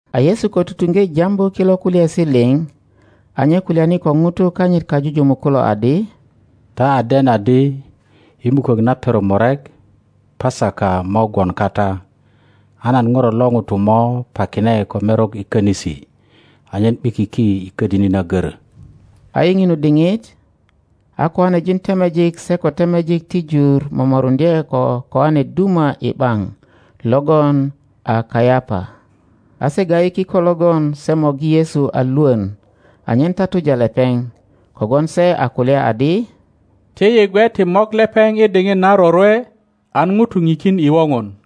A Yesu ko tutuŋge jambu kilo kulyaesi liŋ, a nye kulyani ko ŋutu kanyit kajujumuk kulo adi, Ta a den adi i mukök na perok murek ŋesaka mo gwon kata, a nan ŋuro lo ŋuto mo pakine ko merok i konisi anyen ’bikiki i ködini na görö. A i ŋinu diŋit a koanejin temejik se ko temejik ti jur momoruŋdye ko koane duma i ’baŋ. logon a Kayapa. A se ga ’yi kiko logon se morgi Yesu a lwön anyen tatuja lepeŋ. Kogwon se a kulya adi, Ti yi gwe ti mok lepeŋ i diŋit na rorwe, an ŋutu pikin i woŋon.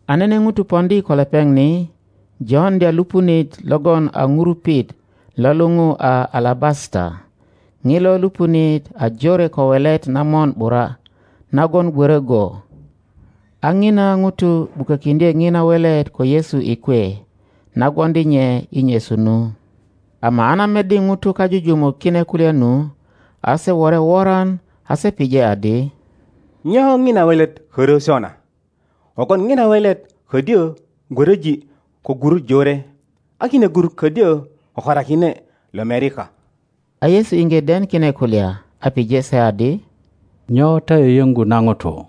a nene ŋuto poŋdi ko lepeŋ. ni joŋdya lupunit logon a ŋurupit lo lupu a alabasata. Ŋilo lupunit a jore ko welet na mon ’bura nagon gwörö go. A ŋina ŋuto ’bukökiŋdye ŋina welet ko Yesu i kwe, na gwoŋdi nye i nyesu nu. 8Ama a na meddi ŋutu kajujumuk kine kulya nu, a se wore woran, a se pije adi, Nyo ŋina welet körö sona? Kogwon ŋina welet ködyö gwöröji ko gurut jore, a kine gurut ködyö kokorakine lomerika. a Yesu iŋge den kine kulya, a pije se adi, Nyo ta yöyöŋgu na ŋuto?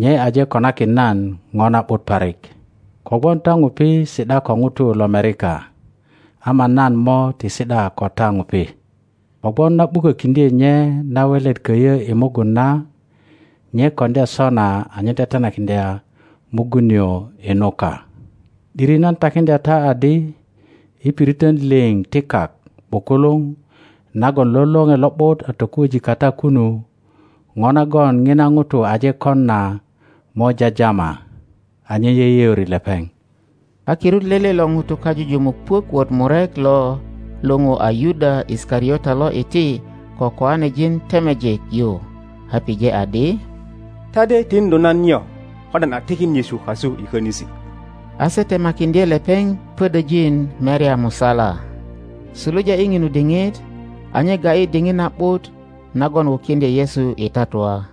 Nye aje konakin nan ŋo na ’but parik. Kogwon ta ŋupi si ’da ko ŋutu lomerika, ama nan mo ti si ’da ko ta ŋupi. Kogwon na ’bukökiŋdye nye na welet köyö i mugun na, nye koŋdya sona anyen tetenakiŋdya mugun nio i nuka. ’Diri nan takiŋdya ta adi, i piritön liŋ ti kak ’bukuluŋ nagon lo Loŋe Lo ’but a tokuöji kata kunu, po nagon ŋina ŋuto aje kon na mo jajama, anyen yeyeori lepeŋ. A kirut lele lo ŋutu kajujumuk puök wot murek lo lupu a Yuda Isikariota lo iti ko kiŋanejin temejik yu, a pije adi, Ta de tiŋdu nan nyo ko nan a tikin Yesu kasu i könisi? A se temakiŋdye lepeŋ. pödöjin merya musala. Suluja i ŋinu diŋit a nye ga ’yi diŋit na ’but nagon wukiŋdye Yesu i tatua.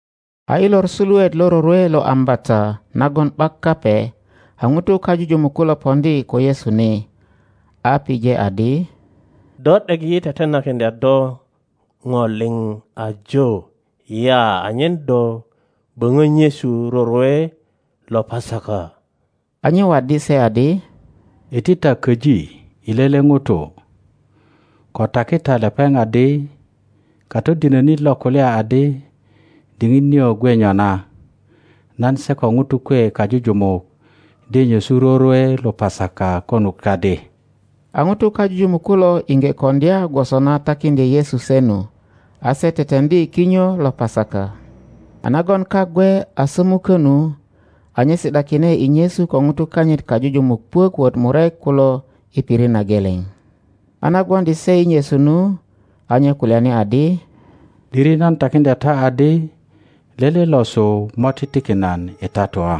A i lor suluet lo rorwe lo Ambata nagon ’bak Kape, a ŋutu kajujumuk kulo poŋdi ko Yesu ni, a pije adi, Do ’dek yi tetenakiŋdya do po liŋ ajo ya anyen do böŋö nyesu rorwe lo Pasaka? a nye waddi se adi, Iti ta köji i lele ŋuto, ko taki ta lepeŋ. adi, Katodinönit lo kulya adi, Diŋit nio gwe nyona. Nan se ko ŋutu kwe kajujumuk de nyesu rorwe lo Pasaka konut kadi. a ŋutu kajujumuk kulo iŋge koŋdya gwoso na takiŋdye Yesu se nu, a se teteŋdi kinyo lo Pasaka. A nagon kak gwe a sömukö nu, a nye si ’dakine i nyesu ko ŋutu kanyit kajujumuk puök wot murek kulo i pirit na geleŋ. a na gwoŋdi se i nyesu nu, a nye kulyani adi, ’Diri nan takiŋdya ta adi, lele losu mo titikin nan i tatua.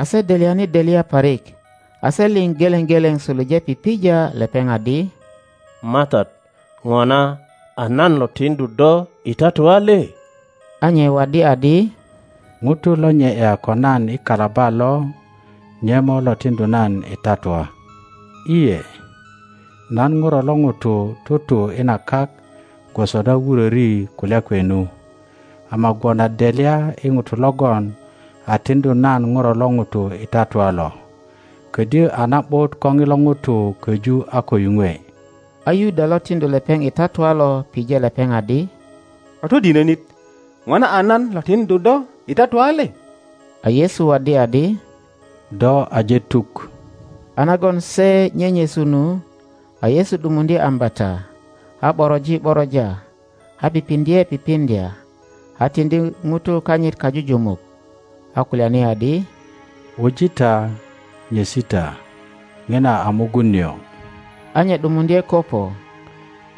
A se delyani delya parik, a se liŋ geleŋ geleŋ suluje pipija lepeŋ adi, MATAT, ŋona a nan lo tiŋdu do i tatua le? A nye waddi adi, Ŋuto lo nye ’ya ko nan i kalaba lo, nye mo lo tiŋdu nan i tatua. lye, nan Ŋuro lo ŋuto tutu i na kak gwoso na wuröri kulya kwe nu, ama gwon a delya i ŋuto logon a tiŋdu nan Ŋuro lo ŋuto i tatua lo! Ködyö a na ’but ko ŋilo ŋuto köju a ko yuŋwe. A Yuda lo tiŋdu lepeŋ i tatua lo pije lepeŋ adi, Katodinönit, ŋona a nan lo tiŋdu do i tatua le? A Yesu waddi adi, Do aje tuk. A nagon se nyenyesu nu, a Yesu ’dumuŋdye ambata, a ’boroji ’boroja a pipiŋdye pipiŋdya, a tiŋdi ŋutu kanyit kajujumuk, a kulyani adi, Wuji ta, nyesi ta; ŋina a mugun nio. a nye ’dumuŋdye koŋo,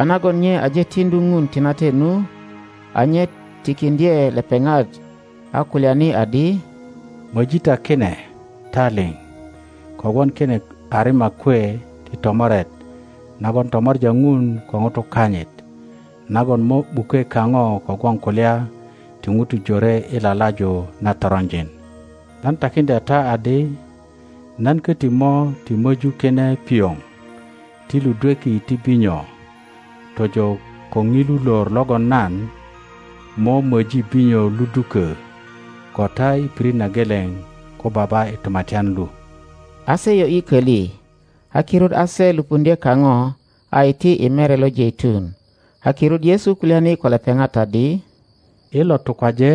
a nagon nye aje tiŋdu Ŋun tinate nu, a nye tikiŋdye lepeŋat, a kulyani adi, Moji ta kine, ta liŋ; kogwon kine a rima kwe ti tomoret nagon tomor a Ŋun ko ŋutu kanyit, nagon mo ’bukwe kaŋo kogwon kulya ti ŋutu jore i lalaju na toronjin. Nan takiŋdya ta adi, nan koti mo ti möju kine pioŋ ti ludweki ti binyo tojo ko ŋilu lor logon nan, mo möji binyo ludukö ko ta i pirit na geleŋ ko Baba i Tumatyan lu. A se yo ’yi koli, a kirut a se lupuŋdye kaŋo, a iti i Mere lo Jeitun. A kirut Yesu kulyani ko lepeŋat adi, I lo tukwaje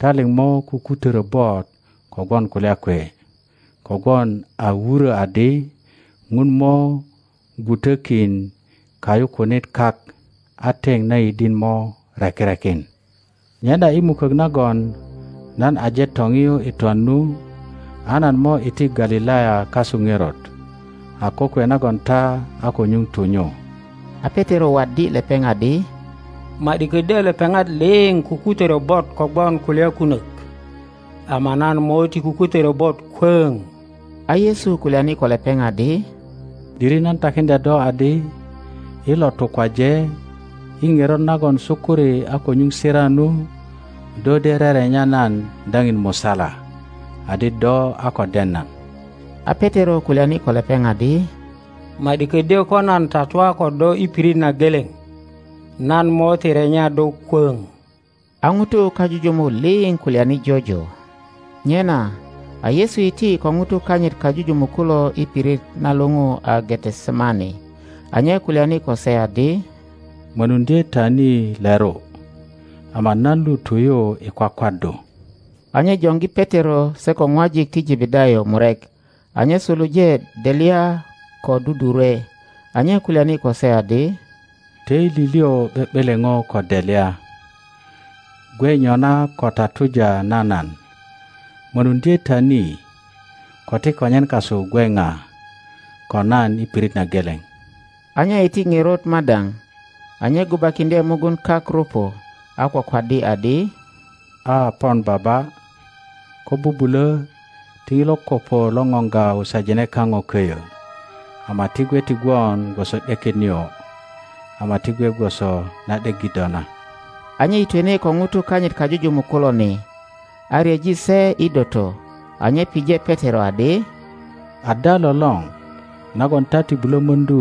ta liŋ mo kukutörö bot kogwon kulya kwe; kogwon a wurö adi, Ŋun mo gwutökin kayukunit kak, a teŋ na yidin mo reki rekin. Nyena i mukök nagon nan aje toŋiyu i twan nu, a nan mo iti Galilaya kasu ŋerot, a kokwe nagon ta a ko nyuŋ tu nyu. A Petero waddi lepeŋ adi, Ma ’di kodyö lepeŋat liŋ kukutörö bot kogwon kulya kunök, ama nan mo ti kukutörö bot kwöŋ. A Yesu kulyani ko lepeŋ adi, ’Diri nan takiŋdya do adi, i lo tukwaje, i ŋerot nagon sukuri a ko nyuŋ sira nu, do de rerenya nan daŋin musala adi do a ko den nan. a Petero kulyani ko lepeŋ adi, Ma ’di ködyö ko nan tatua ko do i pirit na geleŋ, nan mo ti renya do kwöŋ. A ŋutu kajujumuk liŋ kulyani jojo. Nyena a Yesu iti ko ŋutu kanyit kajujumuk kulo i pirit na luŋu a Getesemane, a nye kulyani ko se adi, Mönuŋdye ta ni leru, ama nan lu tu yu i kwakwaddu. A nye joŋgi Petero se ko ŋwajik ti Jebedayo murek, a nye suluje delya ko dudurwe. a nye kulyani ko se adi, Töili liŋ ’be ’beleŋo ko delya, gwe nyona ko tatuja na nan. Mönuŋdye ta ni, ko ti konyen kasu gwe ŋa ko nan i pirit na geleŋ. A nye iti ŋerot madaŋ, a nye gubakiŋdye mugun kak rupu, a kwakwaddi adi, A, pon Baba, ko bubulö ti ŋilo kopo lo ŋoŋga wusajine kaŋo köyö; ama ti gwe ti gwon gwoso ’deket nio, ama ti gwe gwoso na ’deggi do na. a nye yitwene ko ŋutu kanyit kajujumuk kulo ni, a ryeji se i doto, a nye pije Petero adi, Ada lolor nagon ta ti bulo möŋdu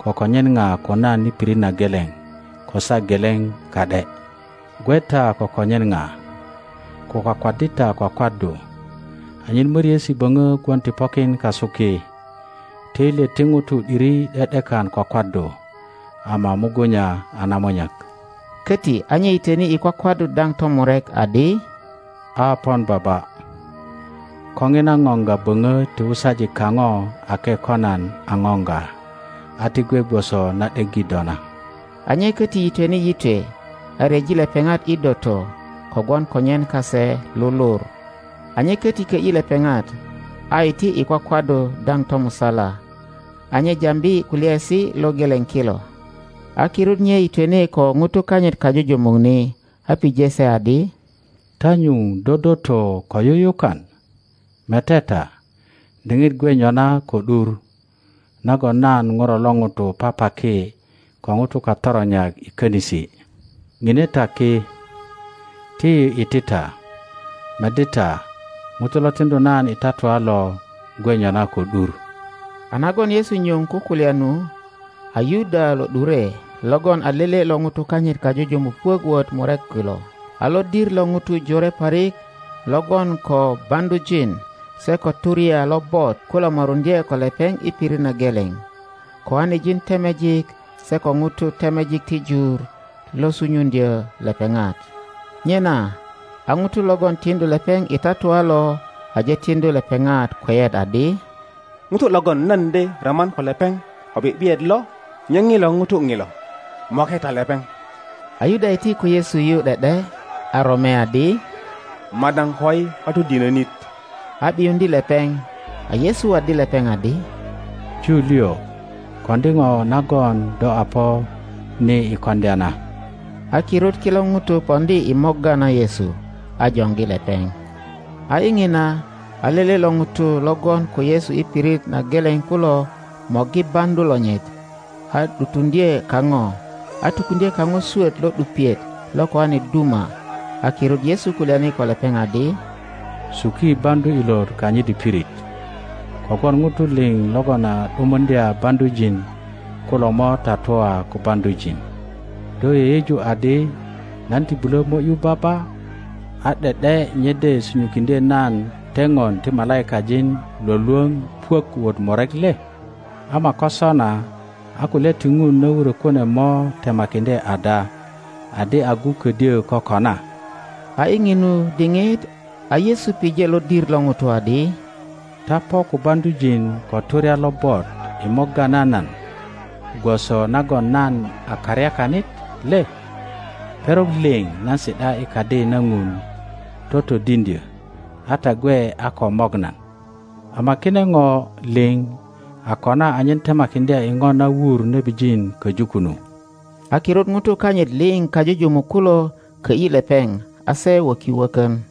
ko konyen ŋa ko nan i pirit na geleŋ ko saa geleŋ ka ’de? Gwe ta ko konyen ŋa, ko kwakwaddi ta kwakwaddu, anyen möriesi böŋö gwon ti pokin kasu ki; töilyet ti ŋutu ’diri ’de ’dikan kwakwaddu ama mugunya a namunyak. Köti a nye yitöni i kwakwaddu daŋ tomurek, adi. A pon Baba, ko ŋina ŋoŋga böŋö ti wusaji kaŋo ake ko nan a ŋoŋga, a ti gwe gwoso na ’deggi do na. nye koti yitwene yitwe, a ryeji lepeŋat i doto, kogwon konyen kase lulur. a nye köti kö ’yi lepeŋat, a iti i kwakwaddu daŋ tomusala, a nye jambi kulyaesi lo geleŋ kilo. a kirut nye yitwene ko ŋutu kanyit kajujumuk ni, a pije se adi, Ta nyuŋ dodoto ko yuyukan? Mete ta, diŋit gwe nyona ko ’dur, nagon nan Ŋuro lo ŋuto papaki ko ŋutu katoronyak i könisi. Ŋine ta ki, ti yi iti ta; meddi ta, ŋuto lo tiŋdu nan i tatua lo gwe nyona ko ’dur. A nagon Yesu nyuŋ kukulya nu, a Yuda lo ’dure logon a lele lo ŋutu kanyit kajujumuk puök wot murek kulo. A lodir lo ŋutu jore parik lo gwon ko baŋdujin se ko turya lobot kulo moruŋdye ko lepeŋ i pirit na geleŋ; kiŋanejin temejik se ko ŋutu temejik ti jur lo sunyuŋdyö lepeŋat. Nyena a ŋuto logon tiŋdu lepeŋ i tatua lo aje tiŋdu lepeŋat kweyet adi, Ŋuto logon nan de roman ko lepeŋ ko ’bi ’biyet lo nye ŋilo ŋuto ŋilo; moke ta lepeŋ. a Yuda iti ko Yesu yu ’de ’de, a rome adi, Madaŋ koi Katodinönit! a ’biyuŋdye lepeŋ. a Yesu waddi lepeŋ adi, Ju liŋ, koŋdi ŋo nagon do a po ni i koŋdya na. A kirut kilo ŋutu poŋdi i morga na Yesu, a joŋgi lepeŋ. A i ŋina, a lele lo ŋutu lo gwon ko Yesu i pirit na geleŋ kulo, morgi baŋdu lonyit a ’dutuŋdye kaŋo, a tukuŋdye kaŋo swöt lo ’dupiet lo kijane duma. a kirut Yesu kulyani ko lepeŋ adi, Suki baŋdu ilot kanyit i pirit, kogwon ŋutu liŋ logon a ’dumundya baŋdujin kulo mo tatua ko baŋdujin. Do yeyeju adi nan ti bulö mo ’yu Baba, a ’de ’de nye de sunyukiŋdye nan teŋon ti malaikajin lwölwöŋ puök wot murek le? Ama ko sona, a kulya ti Ŋun na wurö kune mo temakindye ada adi agu ködyö kokona? A i ŋinu diŋit a Yesu pije lodir lo ŋutu adi, Ta po ko baŋdujin ko turya lobot i morga na nan, gwoso nagon nan a karyakanit le? Perok liŋ nan si ’da i Kadi na Ŋun totodiŋdyö, a ta gwe a ko mok nan. Ama kine ŋo liŋ a kona anyen temakiŋdya i ŋo na wur nebijin köju kunu. A kirut ŋutu kanyit liŋ kajujumuk kulo kö ’yi lepeŋ, a se wöki wökön.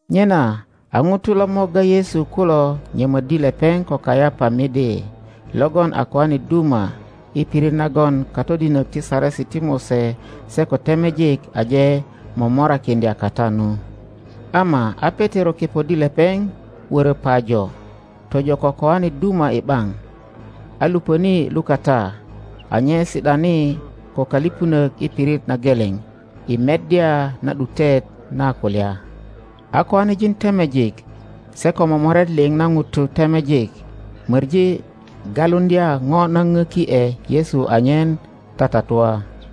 Nyena a ŋutu lo morga Yesu kulo nyömöddi lepeŋ ko Kayapa medelogon a kijane duma, i pirit nagon katodinök ti Saresi ti Mose se ko temejik aje momorakiŋdya kata nu. Ama a Petero kepoddi lepeŋ wörö pajo, tojo ko kijane duma i ’baŋ, a lupöni lukata. a nye si ’dani ko köliŋönök i pirit na geleŋ i meddya na ’dutet na kulya. a kiŋanejin temejik se ko momoret liŋ na ŋutu temejik möŋi galuŋdya ŋo na ŋöki ’e Yesu anyentatatua,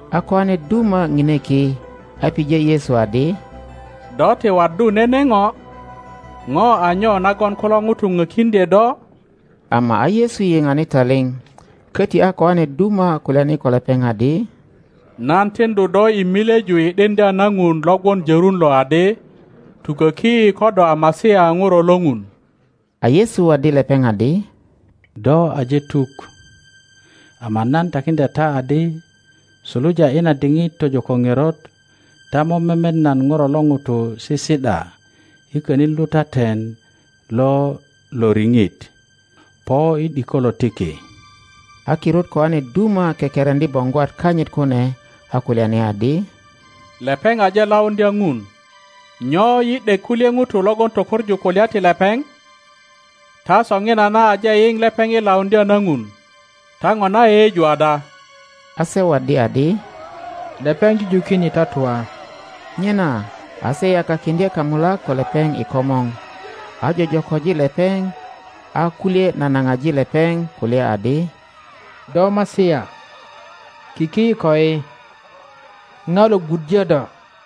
a kijane duma ŋine ki, a pije Yesu adi, Do ti waddu nene ŋo? Ŋo a nyo nagon kulo ŋutu ŋökiŋdye do? Ama a Yesu yiŋani taliŋ. Köti a kijane duma kulyani ko lepeŋ adi, Nan tiŋdu do i milyeju i ’diŋdya na Ŋun lo gwon jörun lo adi, tuköki yi ko do a Masia Ŋuro lo Ŋun. A yesu waddi lepeŋ adi, Do aje tuk. Ama nan takiŋdya ta adi, Suluja i na diŋit tojo ko ŋerot, ta mo memet nan Ŋuro lo ŋuto sisi ’da i könin lutaten lo Loriŋit, po i ’dikolo ti ki. A kirut kijane duma kekereŋdi boŋgwat kanyit kune, a kulyani adi, Lepeŋ aje lauŋdya Ŋun. Nyo yi ’dek kulye ŋutu logon tökoŋu kulya ti lepeŋ? Ta soŋinana aje yiŋ lepeŋ i lauŋdya na Ŋun. Ta ŋona yeyeju ada? A se waddi adi, Lepeŋ jujukin i tatua. Nyena a se yakakiŋdye kamulak ko lepeŋ i komor, a jojoköji lepeŋ, a kulye nanaŋaji lepeŋ, kulya adi, Do Masia, kiki yi koi! Ŋa lo gwuddyö do?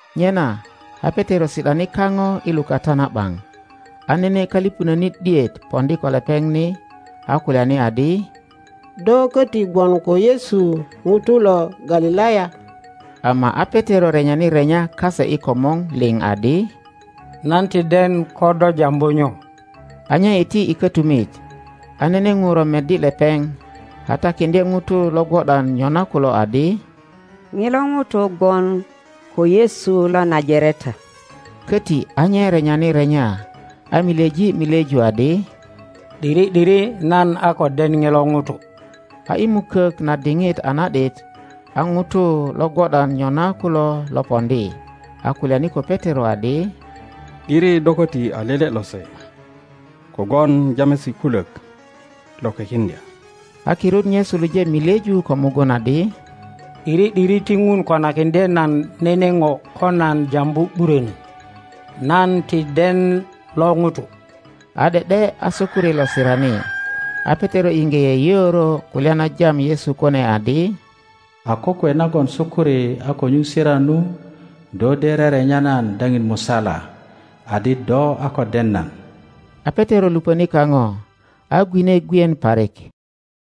Nyena a Petero si ’dani kaŋo i lukata na ’baŋ, a nene köliŋönit ’diet poŋdi ko lepeŋ. ni, a kulyani adi, Do köti gwon ko Yesu ŋuto lo Galilaya. Ama a Petero renyani renya kase i komor liŋ adi, Nan ti den ko do jambu nyo. A nye iti i kötumit, a nene ŋuro meddi lepeŋ, a takiŋdye ŋutu lo gwo ’dan nyona kulo adi, ŋilo ŋuto gwon ko Yesu lo Najareta. Köti a nye renyani renya, a milyeji milyeju adi, ’Diri ’diri nan a ko den ŋilo ŋuto. A i mukök na diŋit a na ’dit, a ŋutu lo gwo ’dan nyona kulo lo poŋdi, a kulyani ko Petero adi, ’Diri do köti a lele lose, kogwon jamesi kulök lo kwekiŋdya. A kirut nye suluje milyeju ko mugun adi, ’Diri ’diri ti Ŋun konakiŋdye nan nene po ko nan jambu ’burönö; nan ti den lo ŋuto. A ’de ’de a sukuri lo sirani. A Petero iŋge yeyeoro kulya na jam Yesu kune adi, A kokwe nagon sukuri a ko nyuŋ sira nu, do de rerenya nan daŋin musala adi do a ko den nan. A Petero lupöni kaŋo, a gwine gwien parik.